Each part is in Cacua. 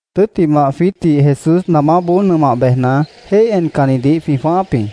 Tʉ́ttimah, jwiítdih Jesús namáboó nʉmah bejna, jéih encannidih jwĩ jwãááp jĩ.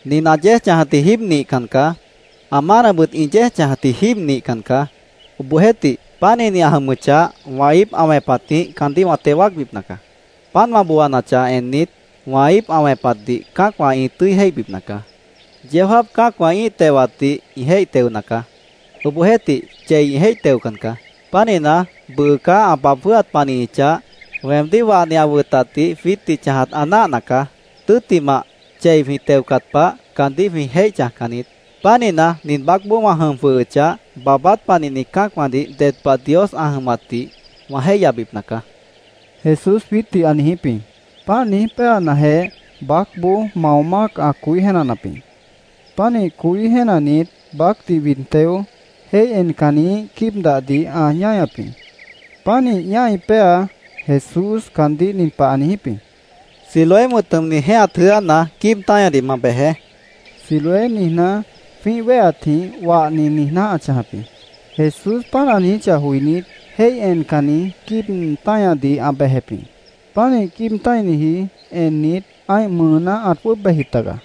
—Nin ã yéej chãjatji jíib nihcan caá. Ã mánabʉt ĩ yéej chãjatji jíib nihcan caá. Obohjeéhtih, pánihni ã jʉmʉchah, wã íip ã wẽpatjĩh caandíh wã teo wáacbipna caá. Páant wã booanachah ennit, wã íip ã wẽpatdih cã́acwã ĩ tʉ́i jéihbipna caá. Yeó jáap cã́acwã ĩ́ih tewatdih ĩ jéih teona caá. Obohjeéhtih, chei ĩ jéih teocan caá. Pánihna, bʉʉ caá ã baab jwʉ́hat panihichah, weemdíh wahni ã wʉtatdih jwiítdih chãjat ã náahna caá. Tʉ́ttimah, chei jwĩ teocat pah, caandíh jwĩ jéih chãjcan niít. Pánihna, nin baácboó wã jʉm jwʉhʉchah, baabát panihni cã́acwãdih ded pah Dios ã jʉmatdih wã jéihyabipna caá, Jesús jwiítdih ã niijíp jĩ. Páant niíj péanajeh, baácboó mao mác ã coí jéenanap jĩ. Pánih coí jéenanit, baácdih wid teo, jéih encanniíh quíibnadih ã ñáñap jĩ. Pánih ñái péa, Jesús caandíh nin pah ã niijíp jĩ: —Siloé wʉ̃t jʉmni jẽ́ehat jʉ́ána quíib táñadih ma bejeé, ã niijíp jĩ. Siloé niijná, jwĩ́ih wéheatjĩh “Wahni”, niijná ã chãjap jĩ. Jesús páant ã niijíchah joinít, jéih encanni quíib táñadih ã bejep jĩ. Pánih quíib tã́iniji ennit, ã́ih mʉʉná ãt jwʉ́ʉb bejjip taga.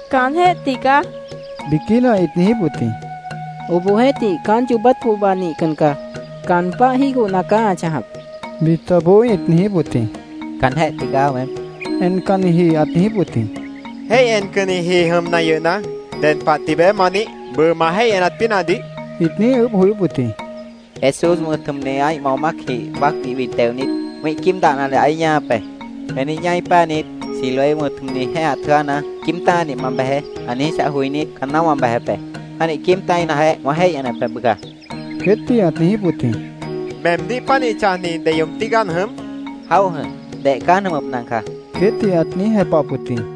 —Caanjéh tigaá, biquína ĩt niijíp wʉt jĩ. —Obohjeéhtih, caán yoobát pohba nihcan caá. Caan páh jígohna caá ã chãjap, bitaboó ĩt niijíp wʉt jĩ. —Caanjéh tigaá, weém, encanniji ãt niijíp wʉt jĩ. —Jéih encanniji jʉmna yʉhna, ¿ded pah tibeé ma nih? bʉʉ ma jéih enat pínahdih, ĩt niíj ʉʉ́bh joyóp wʉt jĩ. —Jesús wʉ̃t jʉmni ã́ih mao mácjĩh baácdih wid teonit, wĩ́ih quíibnadih ãí ñáñap be. Weemdíh ñái péanit, ‘Siloé wʉ̃t jʉmni jẽ́ehat jʉ́ána quíib táñadih ma bejeé’, ã niijíchah joinít, caanná wã bejep be. Pánih quíib tã́inajeh, wã jéih enep be bʉca, queétdih ãt niijíp wʉt jĩ. —¿Meemdíh pánih chãjni deyoob tígaá an jʉm? ĩt niijíp wʉt jĩ. —Jaóh jʉ̃h. Deh caá an jʉmʉpna caá, queétdih ãt niíj jepahap wʉt jĩ.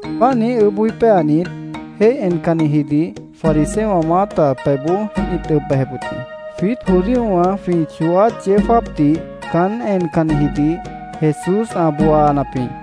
Páant niíj ʉʉ́bh joí péanit, jéih encannijidih fariseowã maáta pebhboó ĩt ʉb bejep wʉt jĩ. Jwiít judíowã jwĩ chooát yeó jáapdih caán encannijidih Jesús ã booanap jĩ.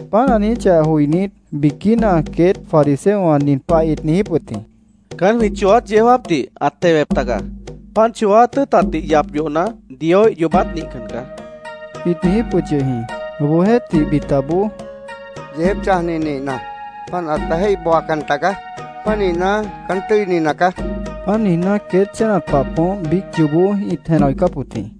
Páant ã niijíchah joinít, biquína queét fariseowã nin pah ĩt niijíp wʉt jĩ: —Caán jwĩ chooát yeó jáapdih ãt tewep taga. Páant chooát tʉ́ʉtatdih yap yohna, Dioíh yoobát nihcan caá, ĩt niijíp wʉt yʉh jĩ. Obohjeéhtih, bitaboó —Yeejép chãjni nihna, páant ãta jéih booacan tagaá. Pánihna, caán tʉ́ini nacaá, ĩt niijíp wʉt jĩ. Páant niijná, queét chénat pah poómp biíc yoobó ĩt jenah joicáp wʉt jĩ.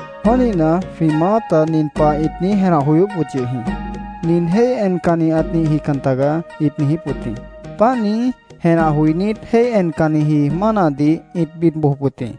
Pánihna, jwĩ maáta nin pah ĩt niíj jenah joyóp wʉt yʉh jĩ: “Nin jéih encanni ãt nihjican tagaá”, ĩt niijíp wʉt jĩ. Páant niíj jenah joinít, jéih encanniji mánadih ĩt bid bojop wʉt jĩ.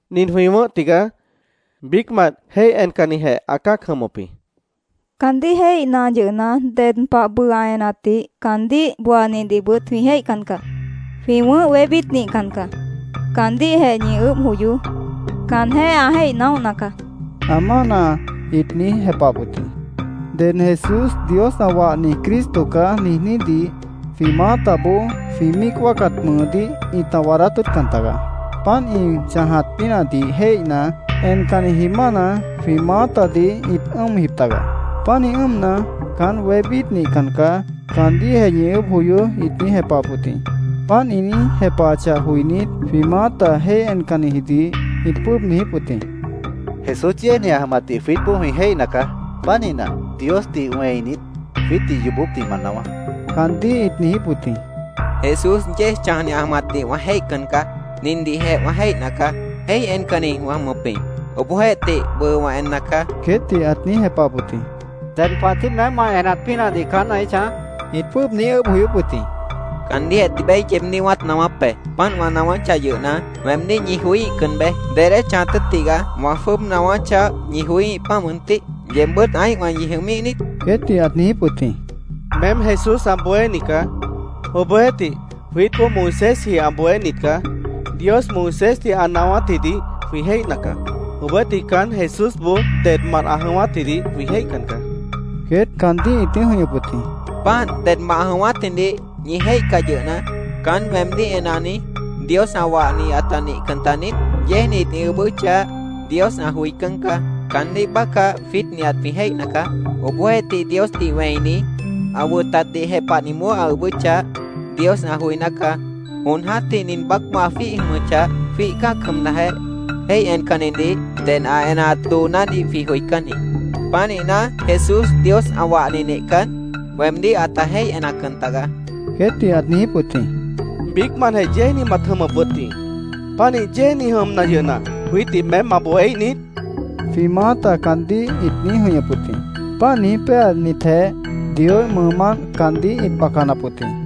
—Nin jwĩ wʉ̃ʉ́h tigaá. Biícmant jéih encannijeh ã cã́ac jʉmʉp jĩ. Caandíh jéihna yʉhna, ded pah bʉʉ ã enatdih, caandíh booanidihbʉt jwĩ jéihcan caá. Jwĩ wʉ̃ʉ́h wébít nihcan caá. Caandíhjeh ñi ʉʉ́bh joyoó. Caanjéh ã jéih naóhna caá, ã mána ĩt niíj jepahap wʉt jĩ. Ded “Jesús Dios ã wahni Cristo caá”, niijnídih jwĩ maátaboó jwĩ míic wáacat mʉʉdíh ĩta waadát tʉ́ʉtcan tagaá. Páant ĩ chãjat pínahdih jéihna, encanniji mána jwĩ maátadih ĩt ʉ́ʉmji tagaá. Pánih ʉ́ʉmna, “Caán wébít nihcan caá. Caandíhjeh ñi ʉʉ́bh joyoó”, ĩt niíj jepahap wʉt jĩ. Páant ĩ niíj jepahachah joinít, jwĩ maáta jéih encannijidih ĩt jwʉ́ʉb niijíp wʉt jĩ: —Jesús yéejni ã jʉmatdih jwiítboó jwĩ jéihna caá. Pánihna, Diosdih wẽinit, jwiítdih yoobópdih ma naáwá, caandíh ĩt niijíp wʉt jĩ. —Jesús yéej chãjni ã jʉmatdih wã jéihcan caá. Nindihjeh wã jéihna caá. Jéih encanni wã jʉmʉp jĩ. Obohjeéhtih, bʉʉ wã enna caá, queétdih ãt niíj jepahap wʉt jĩ. —¿Ded pah tií meém ma enat pínahdih caán ãí chãj? ĩt jwʉ́ʉb niíj ʉʉ́bh joyóp wʉt jĩ. —Caandíhjeh tibeé yeebdíh wãát naáwáp be. Páant wã naáwáchah yʉhna, weemdíh ñi joííhcan beé. ¿Dedé chãjat tʉ́ʉt tigaá wã jwʉ́ʉb naáwáchah, ñi joííh, páant mʉntih? ¿Yeebbʉ́t ã́ihwã ñi jʉmíh niít? queétdih ãt niijíp wʉt jĩ. —Meém Jesús ã bohéni caá. Obohjeéhtih, jwiítboó Moisésji ã bohénit caá. Dios Moisésdih ã naáwátjidih jwĩ jéihna caá. Obohjeéhtih, caán Jesúsboó dedmant ã jʉ̃ʉ́wátjidih jwĩ jéihcan caá, queét caandíh ĩt niíj jʉ̃ihñʉp wʉt jĩ. —¡Páant! Dedmant ã jʉ̃ʉ́wátjidih ñi jéihcah yʉhna, ¿caán weemdíh enani Dios ã wahni ãta nihcan taniít? Yéejnit ĩ ʉʉ́bʉ́chah, Dios ã joicán caá. Caandíh bácah jwiít nihat jwĩ jéihna caá. Obohjeéhtih, Diosdih wẽini, ã wʉtatdih jepahniboó ã ʉʉ́bʉ́chah, Dios ã joiná caá. Jon jã́tih nin baác ã jwíih jʉmʉchah, jwíih cã́ac jʉmnajeh, jéih encannidih ded ã enaat doonádih jwĩ joicán jĩ. Pánihna, Jesús Dios ã wahni nihcan, weemdíh ãta jéih enacan tagaá, queétdih ãt niijíp wʉt jĩ. —Biícmantjeh yéejni mat jʉmʉp wʉt jĩ. ¿Pánih yéejni jʉmna yʉhna, jwiítdih meém ma bohéíh niít? jwĩ maáta caandíh ĩt niíj jʉ̃ihñʉp wʉt jĩ. Páant niíj péanitjeh, Dioíh mʉʉmánt caandíh ĩt bacanap wʉt jĩ.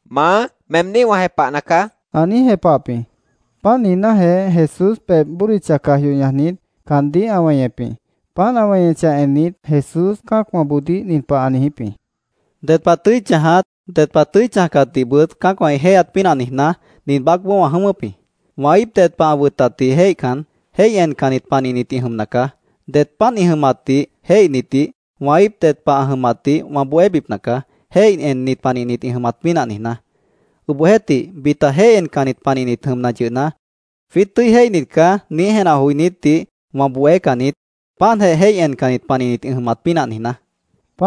—Maá, meemdíh wã jepahna caá, ã niíj jepahap jĩ. Páant niijnájeh, Jesús pebh bódicha caj yoh ñajnit, caandíh ã weñep jĩ. Páant ã weñechah ennit, Jesús cã́acwãboodíh nin pah ã niijíp jĩ: —Ded pah tʉ́i chãjat, ded pah tʉ́i chãjcatdihbʉt cã́acwã ĩ jéihyat pínah niijná, nin baácboó wã jʉ̃ʉ́wʉ́p jĩ. Wã íip ded pah ã wʉtatdih jéihcan, jéih encannit panihnit ĩ jʉmna caá. Det páant ĩ jʉmatdih jéihnitdih wã íip ded pah ã jʉmatdih wã bohébipna caá, jéih ennit panihnit ĩ jʉmat pínah niijná. Obohjeéhtih, bita jéih encannit panihnit jʉmna yʉhna, ‘Jwiít tʉ́i jéihnit caá’, niíj jenah joinítdih wã bohécan niít, páantjeh jéih encannit panihnit ĩ jʉmat pínah niijná, Jesús ã niijíp jĩ.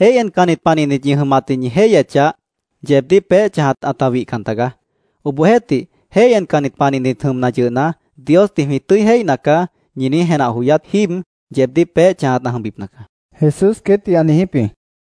—Jéih encannit panihnit ñi jʉmatdih ñi jéihyechah, yeebdíh peéh chãjat ãta wihcan tagaá. Obohjeéhtih, jéih encannit panihnit jʉmna yʉhna, ‘Diosdih jwĩ tʉ́i jéihna caá’, ñi niíj jenah joyát jíib, yeebdíh peéh chãjat ã jʉmbipna caá, Jesús queétdih ã niijíp jĩ.